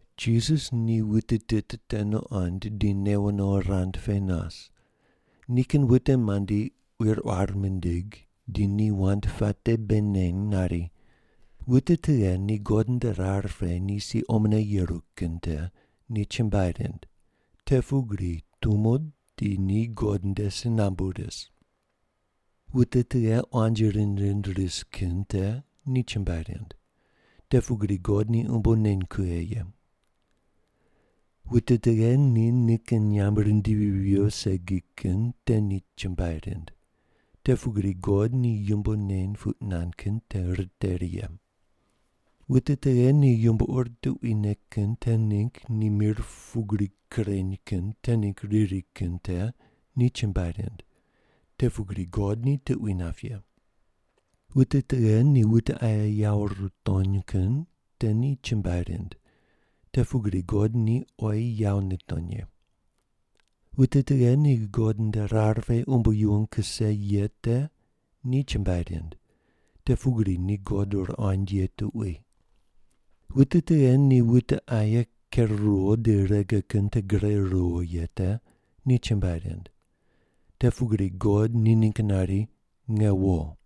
Jisas ni wute tit te nuqond di newo no rand pe nas. Nikin wute mandi quir quar mindig, di ni wand puate bei neny nari: “Wute tughe ni God nde rar pe ni si omone yeru kin te ni chumbuai rind, te pugri tumo di ni God nde si nambu ris. “Wute tughe quanji rind rind ris kin te ni chumbuai rind, te pugri God ni umbo neny kughe ye. “Wute tughe ni nikin nyamb rindivi viyo segi kin te ni chumbuai rind, te pugri God ni yumbo neny puq nand kin te riteri ye. “Wute tughe ni yumbo ur tuquine kin te ningg ni mir pugri kureny kin te ningg riri kin te ni chumbuai rind, te pugri God ni tuqui nap ye. “Wute tughe ni wute aye yawo rutony kin te ni chumbuai rind, te pugri God ni oyi yawo nitony ye. “Wute tughe ni God nde rar pe umbo yuwon kuse ye te ni chumbuai rind, te pugri ni God ruqoind ye tuqui. “Wute tughe ni wute aye ker ruwo di rege kin te gure ruwo ye te ni chumbuai rind, te pugri God ni ningg nari, ‘Nge wo.’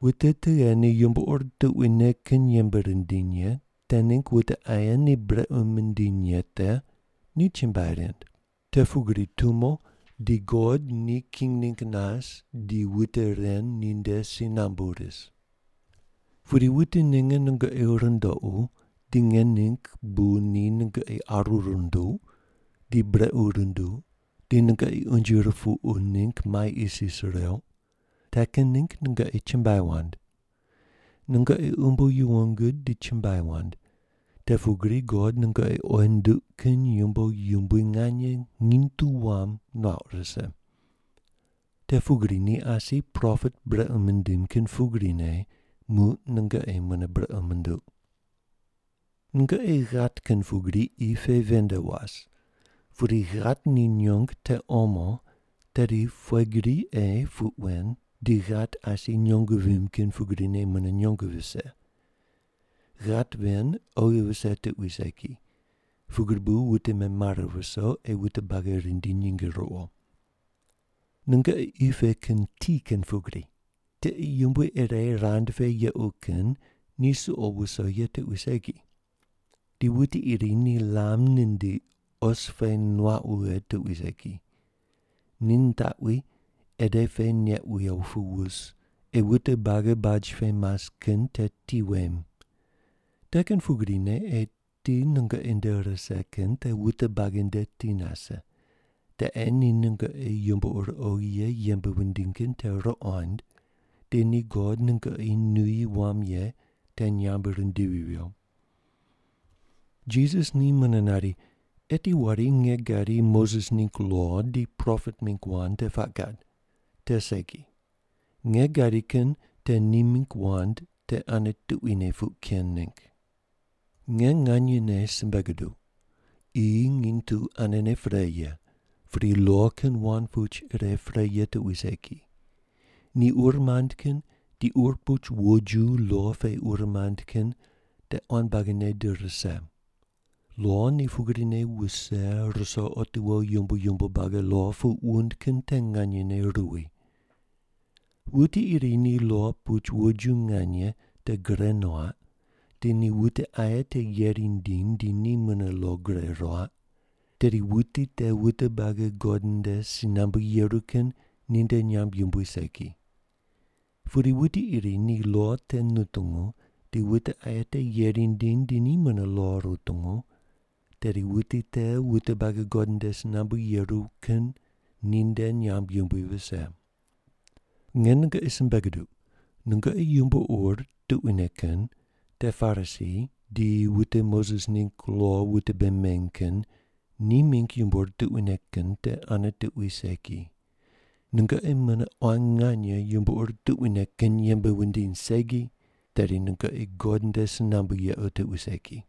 “Wute tughe ni yumbo ur tuquine kin yembe rindiny ye te ningg wute aye ni brequ mindiny ye te ni chumbuai rind, te pugri tumo di God ni king ningg nas di wute ren ninde si nambu ris. “Pudi wute ninge nungoqi rundoqu, di nge ningg bu ni nungoqi aru runduq, di brequ runduq, di nungoqi unje ripuqu ningg mai isis reuq, te kin ningg nungoqi chumbuai wand. Nungoqi umbo yuwon gud di chumbuai wand, te pugri God nungoqi oyi nunduq kin yumbo yumbui nganye nginy tu wam nuauq rise. Te pugri ni asi propet brequ mindim kin pugrine muq nungoqi mune brequ munduq. “Nungoqi ghat kin pugri qi pe ven nde was. Pudi ghat ni nyong te omo, tedi pughe gri ei puq wen di ghat asi nyong vimb kin pugrine mune nyong vise? Ghat ven oghi vise tuqui segi, pugri bu wute memare viso ei wute buagi rindi nyinge ruwo. “Nungoqi qi pe kin ti kin pugri. Tiqe yumbui ire rand pe yequ kin ni suqo wuso ye tuqui segi. Di wuti iri ni lam nindiq, os pe nuaq wughe tuqui segi. Ni nitaqwi ede pe neq wiyo pu wus, ei wute buagi baj pe mas kin te ti wem. Te kin pugrine ei ti nungoqi nde rise kin te wute buagi nde ti nase, te ei ni nungoqi yumbo ur oghi ye yembe wundiny kin te ruqond, di ni God nungoqi nuyi wam ye te nyamb rindivi viyo.” Jisas ni mune nari, “Eti wari nge gadi Moses ningg lo di propet mingg wand te puaq gad. Te segi. Nge gadi kin te ni mingg wand te ane tuquine puq ken ningg. Nge nganyene simbe guduq, qi nginy tu anene pre ye, pudi lo kin wand puch ire pre ye tuqui segi. Ni ur mand kin di ur puch woju lo pe ur mand kin te quan buagine di rise. Lo ni pugrine wuse ruso otiwo yumbo yumbo buagi lo puq wund kin te nganyene ruwi. Wuti iri ni lo puch wojiju nganye te gure nuaq di ni wute aye te yeri nindiny di ni mune lo gure ruaq, tedi wuti te wute buagi God nde si nambu yeru kin ninde nyamb yumbui segi. Pudi wuti iri ni lo te nutungu di wute aye te yeri nindiny di ni mune lo rutungu, tedi wuti te wute buagi God nde si nambu yeru kin ninde nyamb yumbui vise. Nge nungoqi simbe guduq, nungoqi yumbo ur tuquine kin te Parisi di wute Moses ningg lo wute bei meny kin ni mingg yumbo ur tuquine kin te ane tuqui segi, nungoqi mune quan nganye yumbo ur tuquine kin yembe wundiny segi, tedi nungoqi God nde si nambu yequ tuqui segi.”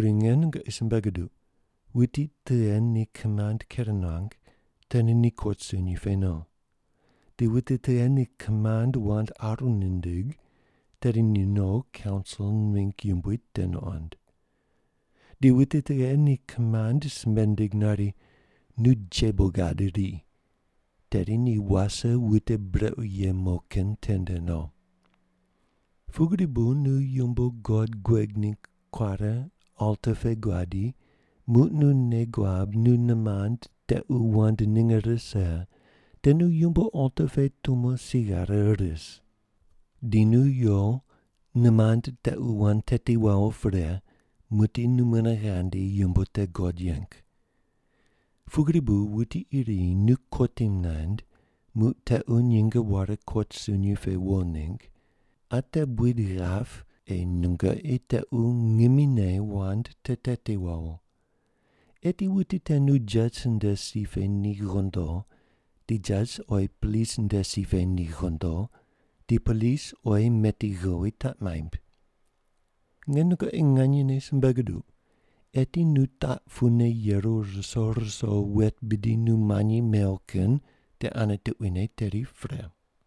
Pudi nge nungoqi simbe guduq, wuti tughe ni kimand ker nuang, tedi ni kot sunyi pe no. Di wuti tughe ni kimand wand aru nindig, tedi ni no kaunsil mingg yumbui te nuqond. Di wuti tughe ni kimand simbe nindig nari, ‘Nu jebo gad iri,’ tedi ni wase wute brequ ye mo kin tende no. “Pugri bu nu yumbo God gueg ningg kuare alta pe guadi, muq nu nei guab nu nimand tequ wand ninge rise, te nu yumbo alta pe tumone si ghare ris. Di nu yo nimand tequ wand teti wawo pre, muqdi nu mune ghandi yumbo te God yeng. “Pugri bu wuti iri nu kotim naind, muq tequ nyinge ware kot sunyi pe wo ningg, ate buid ghap ei nungoqi tequ ngimine wand te teti wawo. Eti wuti te nu jas nde si pe ni ghondo, di jas oyi polis nde si pe ni ghondo, di polis oyi meti ghowi taq maimb. Nge nungoqi nganyene simbe guduq, eti nu taq pune yeru ruso ruso wet bidi nu manyi mew kin te ane tuquine tedi pre.”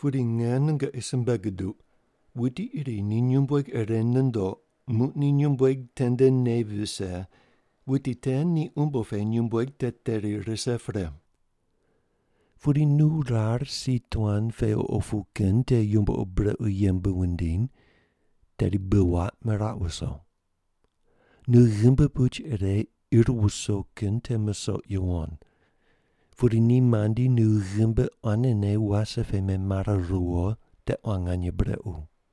Pudi nge nungoqi simbe guduq, wuti iri ni nyumbueg ire nundoq, muq ni nyumbueg tende nei vise, wuti te ni umbo pe nyumbueg te teri rise pre. Pudi nu rar si tuan pe opu kin te yumbo ur brequ yembe wundiny, tedi bi waq meraq wuso. Nu ghimbi puch ire ir wuso kin te musoq yuwon, pudi ni mandi nu ghimbi quanene wase pe memare riwo te quan nganye brequ.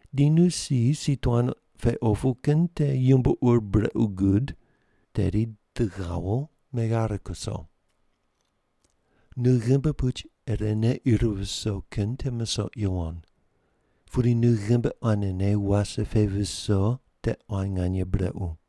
Di nu si si tuan pe opu kin ni yumbo ur brequ gud, tedi di ghawo meghare kuso. Nu ghimbi puch irene ir viso kin te musoq yuwon, pudi nu ghimbi quanene wase pe viso te quan nganye brequ.”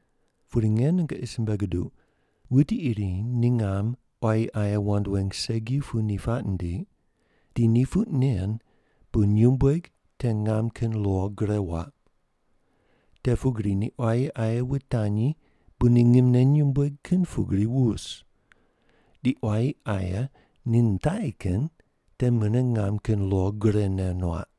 Pudi nge nungoqi simbe guduq, wuti iri ni ngam quayi aye wand weng segi pu ni puaq nindiq, di ni puq nen bu nyumbueg te ngam kin lo gure waq. Te pugri ni quayi aye wutanyi bu ni ngimne nyumbueg kin pugri wus. Di quayi aye ni nitaqi kin te mune ngam kin lo gurene nuaq.”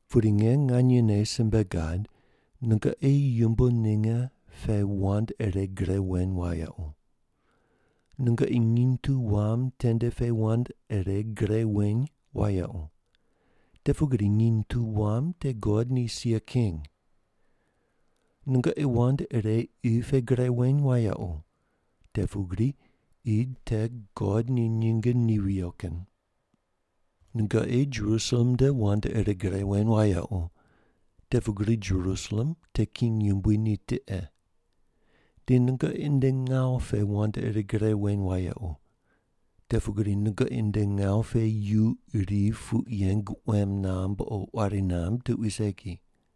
Pudi nge nganyene simbe gad, nungoqi yumbo ninge pe wand ire gre weny wayequ. Nungoqi nginy tu wam tende pe wand ire gre weny wayequ, te pugri nginy tu wam te God ni sia king. Nungoqi wand ire qi pe gre weny wayequ, te pugri qi te God ni nyinge ni viyo kin. Nungoqi Jerusalem nde wand ire gre weny wayequ, te pugri Jerusalem te king yumbui ni tiqe. Di nungoqi nde ngawu pe wand ire gre weny wayequ, te pugri nungoqi nde ngawu pe yu iri puq yeng quem namb o quari namb tuqui segi.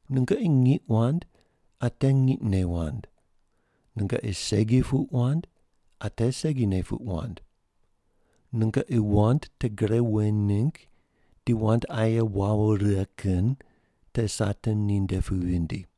Nungoqi ngiq wand ate ngiqne wand, nungoqi segi puq wand ate segine puq wand. Nungoqi wand te gre weny ningg di wand aye wawo righe kin te Satan ninde pu vindi.”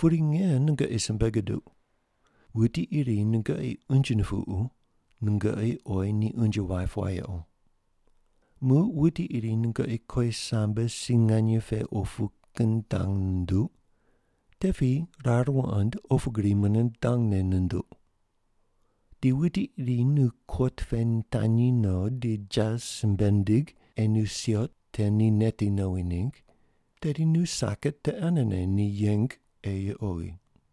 Pudi nge nungoqi simbe guduq, wuti iri nungoqi unje nupuqu, nungoqi oyi ni unje waip wayequ. Muq wuti iri nungoqi kowisambe si nganye pe opu kin dang nunduq, te piyi rar wuqoind opu gri mune dangne nunduq. Di wuti iri nu kot pe nitanyi no di jas simbe nindig ei nu siot te ni neti nowi ningg, tedi nu saket te anene ni yeng ei oghi.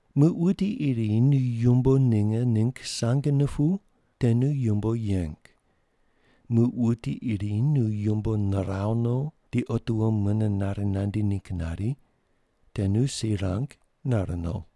Muq wuti iri nu yumbo ninge ningg sang nupuw, te nu yumbo yeng. Muq wuti iri nu yumbo niraw no di otiwo mune nare nandi ningg nari, te nu si rang nare no.”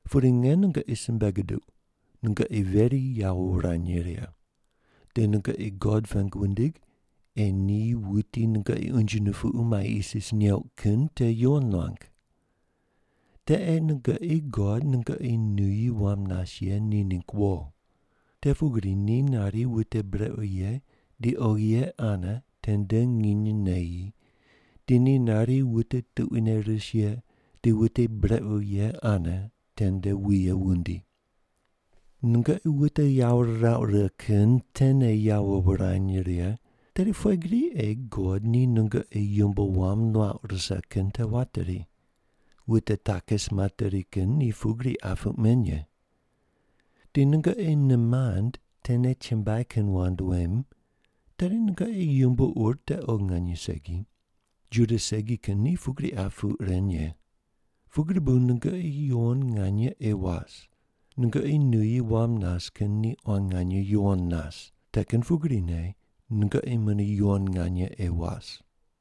Pudi nge nungoqi simbe guduq, nungoqi veri yawo wurany righe, di nungoqi God pengu wundig ei ni wuti nungoqi unje nupuqu mai isis neuq kin te yuwon nuang. Te ei nungoqi God nungoqi nuyi wam nas ye ni ningg wo. Te pugri ni nari wute brequ ye di oghi ye ane tende nginy neyi, di ni nari wute tuquine ris ye di wute brequ ye ane tende wuye wundi. Nungoqi wute yawo rirauq righe kin tene yawo wurany righe, tedi pughe gri ei God ni nungoqi yumbo wam nuauq rise kin te wateri? Wute takis materi kin ni pugri qa puq men ye. Di nungoqi nimand tene chumbuai kin wand wem, tedi nungoqi yumbo ur te oghi nganye segi. Juda segi kin ni pugri qa puq ren ye. Pugri bu nungoqi yuwon nganye ei was. Nungoqi nuyi wam nas kin ni quan nganye yuwon nas, te kin pugrine nungoqi mune yuwon nganye ei was.”